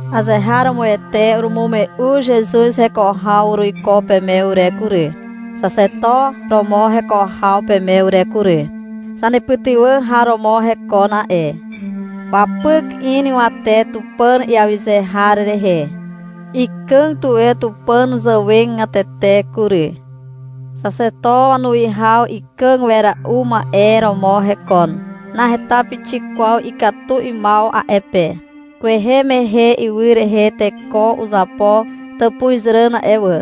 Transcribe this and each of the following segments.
Azeharomoete urumume'u Zezuz heko haw uruiko peme ure kury, xaxeto romo heko haw peme ure kury. Zanepytywà har romo hekon a'e. Wapyk in ywate Tupàn iawyze har rehe. Ikàg tuwe Tupàn zàwegatete kury. Xaxeto wanuwihaw ikàg wera'u ma'e romo hekon. Naheta pixik kwaw ikatu 'ymaw a'e pe. Kwehe mehe ywy rehe teko uzapo tàpuzràn a'e wà,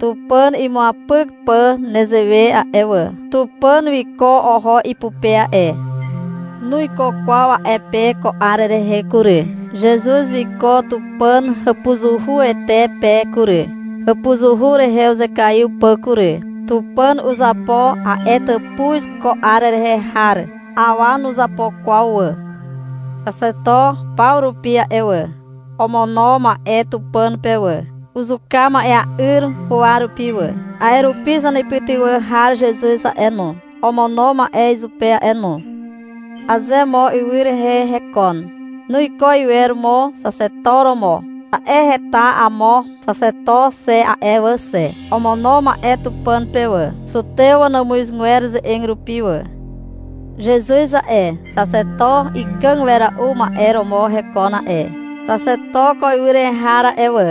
Tupàn imuapyk pà nezewe a'e wà. Tupàn wiko oho ipupe a'e. Nuiko kwaw a'e pe ko 'ar rehe kury. Zezuz wiko Tupàn hàpuzuhuete pe kury, hàpuzuhu rehe uzekaiw pà kury. Tupàn uzapo a'e tàpuz ko 'ar rehe har. Awa nuzapo kwaw wà. Xaxeto paw rupi a'e wà, omono ma'e Tupàn pe wà. Uzuka ma'ea'yr huwa rupi wà. A'e rupi zanepytywà har Zezuz a'e no, omono ma'e izupe a'e no. Aze mo ywy rehe hekon, nuiko iwer mo xaxeto romo. Ta'e heta amo xaxeto xe a'e wà xe. Omono ma'e Tupàn pe wà, zutew wanàmuzgwer ze'eg rupi wà. Zezuz a'e, xaxeto ikàg wera'u ma'e romo hekon a'e. Xaxeto ko ywy rehe har a'e wà,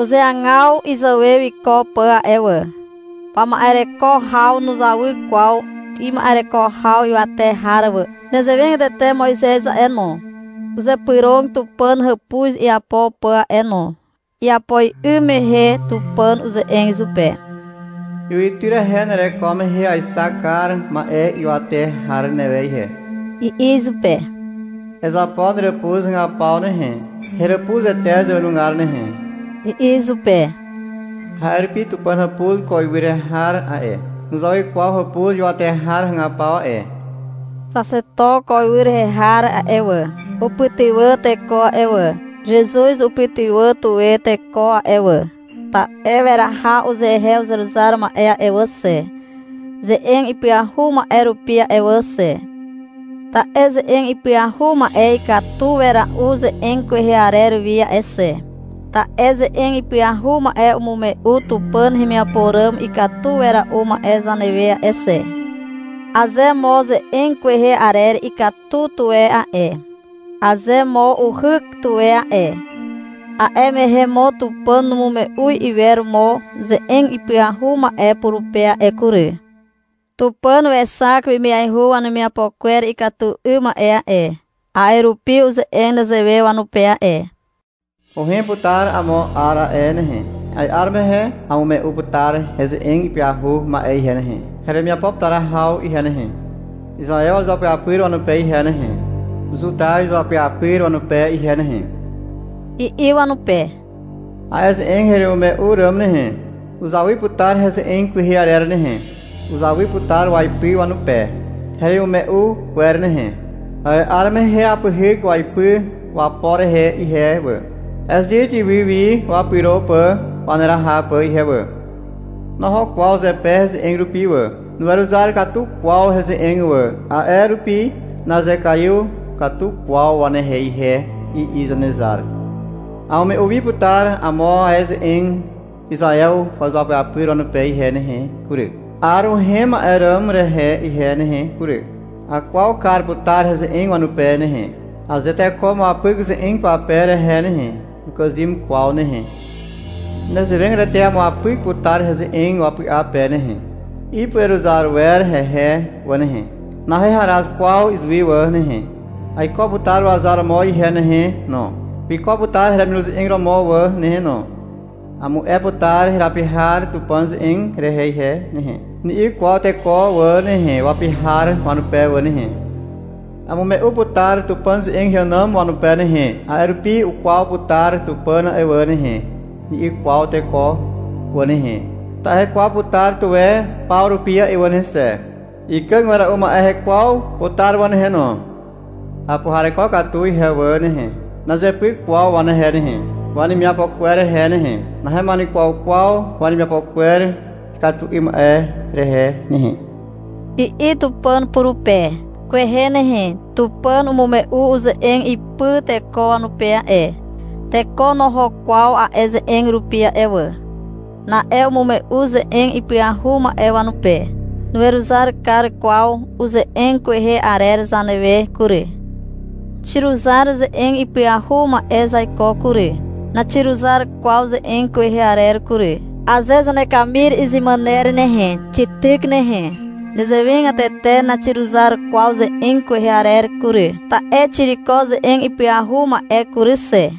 uzeagaw izàwe wiko pà a'e wà. Wama'ereko haw nuzawy kwaw ima'ereko haw ywate har wà. Nezewegatete Moizez a'e no, uzypyrog Tupàn hàpuz iapo pà a'e no. Iapo 'ym mehe Tupàn uze'eg izupe. — Ywytyr rehe nereko mehe aexak kar ma'e ywate har newe ihe, i'i izupe. Ezapo heràpuz hagapaw nehe, heràpuzete zàwenugar nehe, i'i izupe. A'e rupi Tupàn hàpuz ko ywy rehe har a'e, nuzawy kwaw hàpuz ywate har hagapaw a'e. Xaxeto ko ywy rehe har a'e wà, upytywà teko a'e wà. Zezuz upytywà tuwe teko a'e wà. Ta'e weraha uzehe uzeruzar ma'e a'e wà xe, ze'eg ipyahu ma'e rupi a'e wà xe. Ta'e ze'eg ipyahu ma'e ikatu wera'u ze'eg kwehe arer wi a'e xe. Ta'e ze'eg ipyahu ma'e umume'u Tupàn hemiapo ràm ikatu wera'u ma'e zanewe a'e xe. Aze mo ze'eg kwehe arer ikatu tuwe a'e, aze mo uhyk tuwe a'e, a'e mehe mo Tupàn numume'u iwer mo ze'eg ipyahu ma'e purupe a'e kury. Tupàn wexak wemiaihu wanemiapo kwer ikatu 'ym ma'e a'e. A'e rupi uze'eg nezewe wanupe a'e. — Uhem putar amo 'ar a'e nehe. A'e 'ar mehe amume'u putar heze'eg ipyahu ma'e ihe nehe, heremiapo putar haw ihe nehe, Izaew izuapyapyr wanupe ihe nehe, Zuta izuapyapyr wanupe ihe nehe, i'i wanupe. A'e ze'eg heremimume'u ràm nehe, uzawy putar heze'eg kwehe arer nehe. Uzawy putar waipy wanupe heremimume'u kwer nehe. A'e 'ar mehe apyhyk waipy wapo rehe ihe wà, Ezit ywy wi wapyro pà waneraha pà ihe wà. Noho kwaw zepe heze'eg rupi wà. Nuweruzar katu kwaw heze'eg wà. A'e rupi nazekaiw katu kwaw wanehe ihe, i'i Zanezar. — Amume'u wi putar amo ae heze'eg Izaew izuapyapyr wanupe ihe nehe kury, 'ar uhem ma'e ràm rehe ihe nehe kury. Akwaw kar putar heze'eg wanupe nehe. Aze teko umuapyk ze'eg pape rehe nehe, nukàzym kwaw nehe. Nezewegatete amuapyk putar heze'eg wapy'a pe nehe. Ipureruzar wer hehe wà nehe. Naheharaz kwaw izuwi wà nehe. Aiko putar wazar romo ihe nehe no. Wiko putar heremiruze'eg romo wà nehe no. — Amu'e putar herapi har Tupàn ze'eg rehe ihe nehe, ni'i kwaw teko wà nehe, wapi har wanupe wà nehe. — Amume'u putar Tupàn ze'eg heànàm wanupe nehe, a'e rupi ukwaw putar Tupàn a'e wà nehe, ni'i kwaw teko wà nehe. Ta'e hekwaw putar tuwe paw rupi wà nehe xe. Ikàg wera'u ma'e hekwaw putar wà nehe no. Apuhareko katu ihe wà nehe. Nazepyk kwaw wanehe nehe, wanemiapo kwer rehe nehe. Nahema'enukwaw kwaw wanemiapo kwer ikatu 'ym ma'e rehe nehe, i'i Tupàn purupe. Kwehe nehe Tupàn umume'u uze'eg ipy teko wanupe a'e. Teko noho kwaw a'e ze'eg rupi a'e wà. Na'e umume'u ze'eg ipyahu ma'e wanupe. Nuweruzar kar kwaw uze'eg kwehe arer zanewe kury. Xiruzar ze'eg ipyahu ma'e zaiko kury. Naxiruzar kwaw ze'eg kwehe arer kury. Aze zanekamir izemàner nehe, xityk nehe. Nezewegatete naxiruzar kwaw ze'eg kwehe arer kury. Ta'e xiriko ze'eg ipyahu ma'e kury xe.